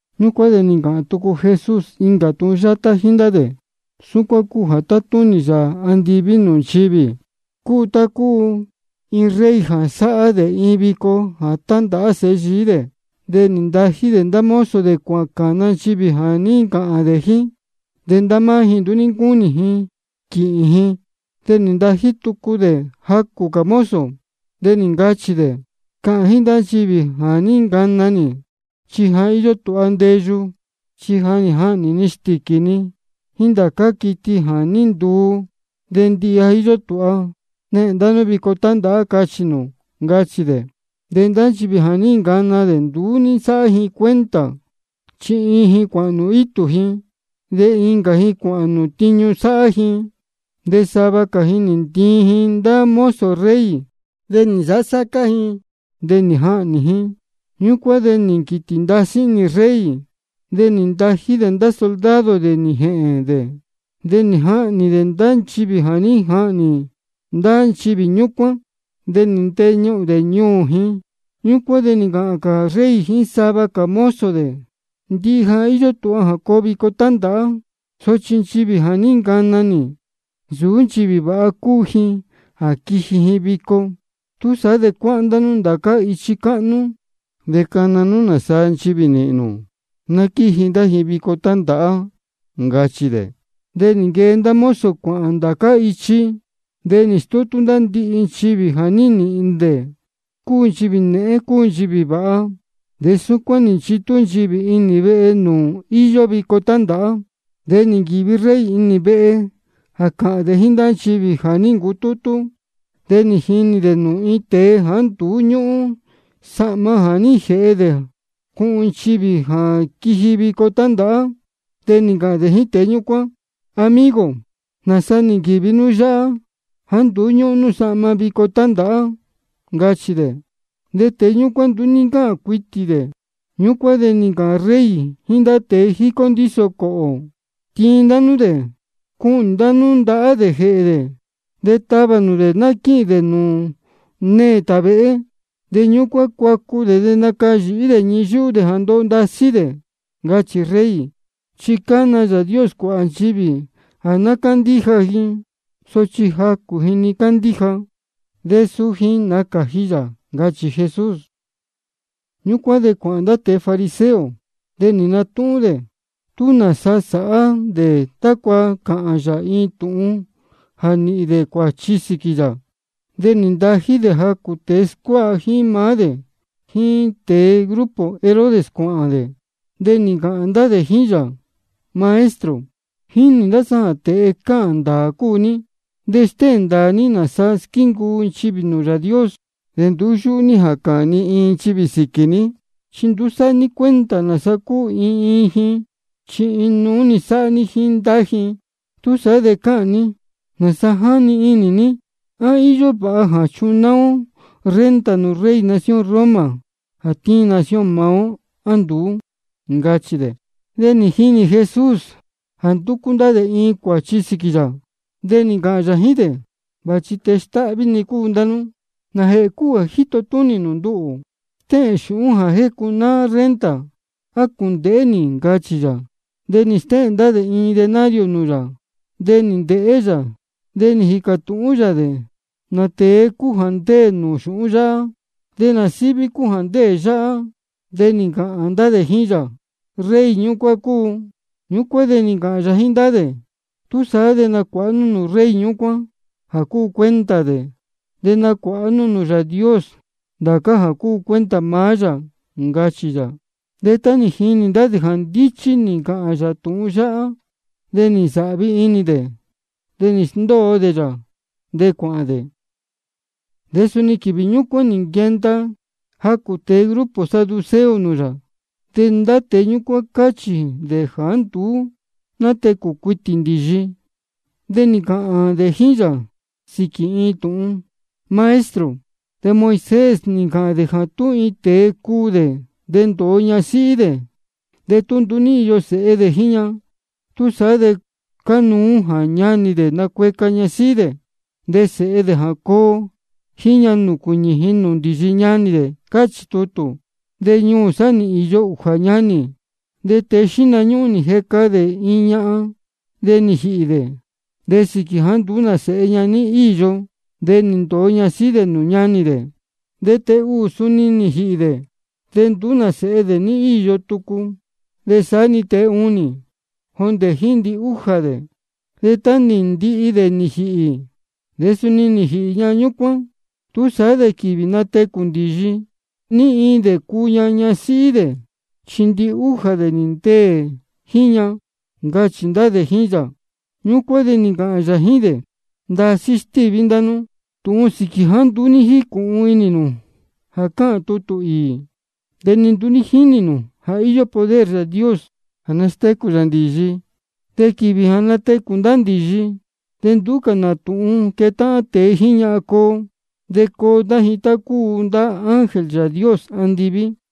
Ñúcuán de nī ncāhān tucu Jesús incā tūhun yátá jíín ndá dē: Súcuán cúu jā tátúnī Yāā andiví nūū nchivī: Cúu tá cúu iin rey jā sāhá dē iin vico jā tandāhá sēhe yií dē. De nī ntají dē ndá mozo dē cuācāna nchivī jā ní ncāhān dē jíín. De ndá máá ji nduú ní ncúnī ji quīhīn ji. De nī ntají tucu dē jacū cā mozo, de nī ncachī dē: Cāhān jíín nchivī jā ní ncana nī, ja íyó tūha ndeyu. Chi ja nī jahnī ni stīquī ni jíín ndá cā quiti jā ní nduu, de ndihi ja íyó tūha. Nehēn ndá nú vico tándāhá. Cachī nū, ncachī dē. De ndá nchivī jā ní ncana dē nduú ní nsáhá ji cuenta. Chi iin ji cuāhān nūū itū ji, de incā ji cuāhān nūū tiñu sáhá ji. De sava cā ji nī ntiin ji ndá mozo rey, de nī nsāhá sácá ji nūū, de nī jahnī ji. Ñúcuán de nī nquītī ndasí inī rey. De nī ntají dē ndá soldado dē nī jēhēn dē, nī jahnī dē ndá nchivī jā ní jahnī ndá ndīyi ñúcuán, de nī nteñuhūn dē ñuū ji. Ñúcuán de nī ncāhān rey jíín sava cā mozo dē: Ndihi ja íyó tūha jā coo vico tándāhá. Sochi nchivī jā ní ncana nī, nsūú nchivī vāha cúu ji jā quiji ji vico. Túsaá de cuáhán ndá nú ndācá ichi cáhnú cā, de cana nú nāsaa nchivī nīhīn nū, ná quíji ndá ji vico tándāhá. Ncachī dē. De nī nquee ndá mozo cuāhān ndācá ichi. De nī nastútú dē ndihi nchivī jā ní nīhīn dē, cúu nchivī nēhén, cúu nchivī vāha. De súcuán nī nchitú nchivī inī vehe nūū íyó vico tándāhá. De nī nquīvi rey inī vehe jā cāhān dē jíín nchivī jā ní ncutútú. De nī jinī dē nūū iin tēe jāá nduú ñúhún sahma jā ní jēhe dē cuhun nchivī jā quiji vico tándāhá. De nī ncāhān dē jíín tēe ñúcuán: Amigo, ¿nāsa nī nquīvi nú yáhá jāá nduú ñúhún nú sahma vico tándāhá? ncachī dē. De tēe ñúcuán nduú ní ncáhān cuitī dē. Ñúcuán de nī ncāhān rey jíín ndá tēe jícó ndíso cōhō: Tiin ndá nú dē, cuhnī nū ndahá dē jēhē dē, de tavā nū dē ná quíhīn dē nūū neē tāvēhé. De ñúcuán cuacu dē de nacayīhí dē ñii yúhú dē jā ndoho ndasí dē. Ncachī rey. Chi cána Yāā Dios cuāhā nchivī jā ná cándíja ji. Sochi jacū ji-ni cándíja, de suu ji nácāji yā, ncachī Jesús. Ñúcuán de cuāhān ndá tēe fariseo, de nī natúhún dē tú nāsa sāhá dē tácua cāhān yā iin tūhun jā nīhīn dē cuāchi sīquī yā. De nī ntají dē jacū tēe scuáha jíín maá dē jíín tēe grupo Herodes cuāhān dē. De nī ncāhān ndá dē jíín yā: Maestro, jínī ndá sá jā tēe cáhān ndāā cúu ní, de stéhēn ndāā ní nāsa squíncuu nchivī nūū Yāā Dios. De nduú yúhú ní jā cāhān ni iin nchivī sīquī ní, chi nduú sáhá ní cuenta nāsa cúu iin iin ji, chi inuú-ni sáhá ní jíín ndá ji. Túsaá de cāhān ní nāsa jáni inī ní: ¿A íyó vāha jā chunáá ó renta nūū rey nación Roma jā tíin nación maá ó, á nduú? ncachī dē. De nī jinī Jesús jā ndúcú ndá dē iin cuāchi sīquī yā. De nī ncāhān yā jíín dē: Vāchi tēe stáhví-ni cúu ndá nú. ¿Nājēhē cúu jā jíto túnī nū nduhū? Stéhēn xūhún jā jécunáá renta ná cúndēhé nī, ncachī yā. De nī stéhēn ndá dē iin denario nūū yā. De nī ndēhé yā, de nū jīcā tūhún yā dē: ¿Nā tēe cúu jā ndéē nūū xūhún yáhá, de nā síví cúu jā ndéē yáhá? De nī ncāhān ndá dē jíín yā: Rey ñúcuán cúu. Ñúcuán de nī ncāhān yā jíín ndá dē: Túsaá de nacuāha nú nūū rey ñúcuán jā cúu cuenta dē, de nacuāha nú nūū Yāā Dios ndācá jā cúu cuenta maá yā, ncachī yā. De tá nī jini ndá dē jā ndíchí nī ncāhān yā tūhun yáhá, de nī nsāhvi inī dē, de nī sndóo dē yā, de cuāhān dē. De suni quīvī ñúcuán nī nquenda jacū tēe grupo saduceo nūū yā. De ndá tēe ñúcuán cáchī dē jāá nduú nátecū cuitī ndīyi. De nī ncāhān dē jíín yā sīquī iin tūhun: Maestro, de Moisés nī ncāhān dē jā tú iin tēe cuū dē, de ndōo ñasíhí dē, de tú nduú ní íyo sēhe dē jíín ña, túsaá de cánuú jā ñanī dē nacueca ñasíhí dē, de sēhe dē jā coo jíín ña, nūcuīñī ji nūū ndīyi ñanī dē. Cáchī tutū. De ñuū sá nī īyo ūjā ñanī. De tēe xíhna ñúhún nī jeca dē iin ñahan. De nī jīhī dē. De sīquī jāá nduú nā sēhe dē ní íyo, de nī ndōo ñasíhí dē nūū ñanī dē. De tēe ūū suni nī jīhī dē, de nduú nā sēhe dē ní íyo tucu. De saá-ni tēe ūnī, jondē jíín ndihújā dē. De tá nī ndihi dē nī jīhī, de suni nī jīhī ñahan ñúcuán. Túsaá de quīvī natecū ndīyi, ¿ní iin dē cuu ña ñasíhí dē? Chi ndihújā dē nī ndeē jíín ña, ncachī ndá dē jíín yā. Ñúcuán de nī ncāhān yā jíín dē: Ndasí stíví ndá nú tūhun sīquī jāá nduú jícūhun inī nū jā cáhān tutū īī, de ni nduú jínī nū jā íyó poder Yāā Dios jā nastécū yā ndīyi. Chi quīvī jā natecū ndá ndīyi, de nduú cā nā tūhun quetáhán tēe jíín ñahan coo. Chi coo ndá ji tá cúu ndá ángel Yāā Dios andiví.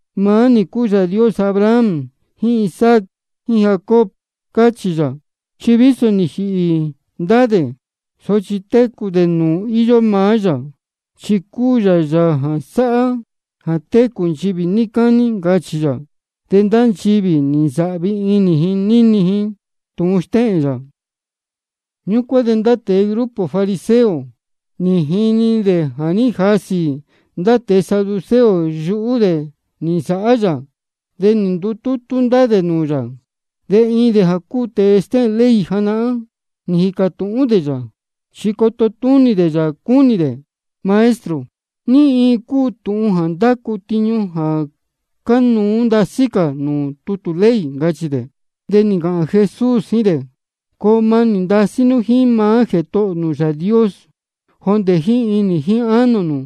Maá nī cúu Yāā Dios Abraham jíín Isaac jíín Jacob, cáchī yā. Chi vísō ja nī jīhī ndá dē, sochi técū dē nūū íyó maá yā, chi cúu yā Yāā jā sáhá jā técū nchivī níí cání, ncachī yā. De ndá nchivī nī nsāhvi inī ji níni ji tūhun stéhēn yā. Ñúcuán de ndá tēe grupo fariseo nī jinī dē jā ní jasī ndá tēe saduceo yuhú dē nī nsāhá yā. De nī ndutútú ndá dē nūū yā. De iin dē jā cúu tēe stéhēn ley janahán nī jīcā tūhún dē yā, chi coto túnī dē yā cúnī dē: Maestro, ¿ní iin cúu tūhun jā ndácu tiñu jā cánuú ndasí cā nūū tutū ley? ncachī dē. De nī ncāhān Jesús jíín dē: Coo manī ndasí nú jíín maá Jētohō nū Yāā Dios, jondē jíín inī jíín ánō nū,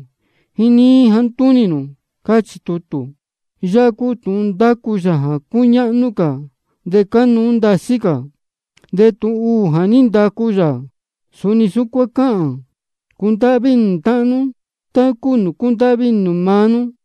jíín níí jāá ntúnī nū, cáchī tutū. Yáhá cúu tūhun ndácu yā jā cúñáhnú cā de cánuú ndasí cā. De tūhun ūū jā ní ndacu yā, suni súcuán cáhān: Cundáhví inī nū táhán nú tá cúu nūū cúndáhví inī nū maá nú.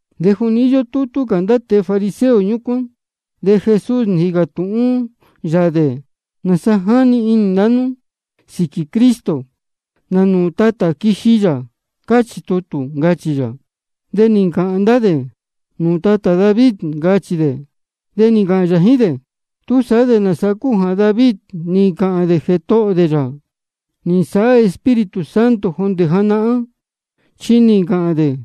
De juni íyó tútú cā ndá tēe fariseo ñúcuán, de Jesús nī jīcā tūhún yā dē: ¿Nāsa jáni inī ndá nú sīquī Cristo? ¿Nā nūū tatā quiji yā, cáchī tutū? ncachī yā. De nī ncāhān ndá dē: Nūū tatā David, ncachī dē. De nī ncāhān yā jíín dē: ¿Túsaá de nāsa cúu jā David nī ncāhān dē Jētohō dē yā, nī nsāhá Espíritu Santo jondē janahán? Chi nī ncāhān dē: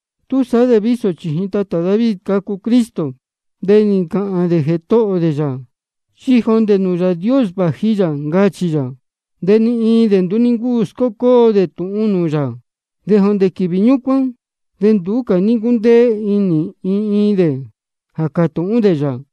Túsaá de vísō chījin tatā David cacu Cristo, de nī ncāhān dē Jētohō dē yā, chi jondē nūū Yāā Dios vāji yā, ncachī yā. De ni iin dē nduú ní ncúu scócóo dē tūhun nūū yā. De jondē quīvī ñúcuán de nduú cā ní ncúndéé inī ni iin dē jā cātūhún dē yā.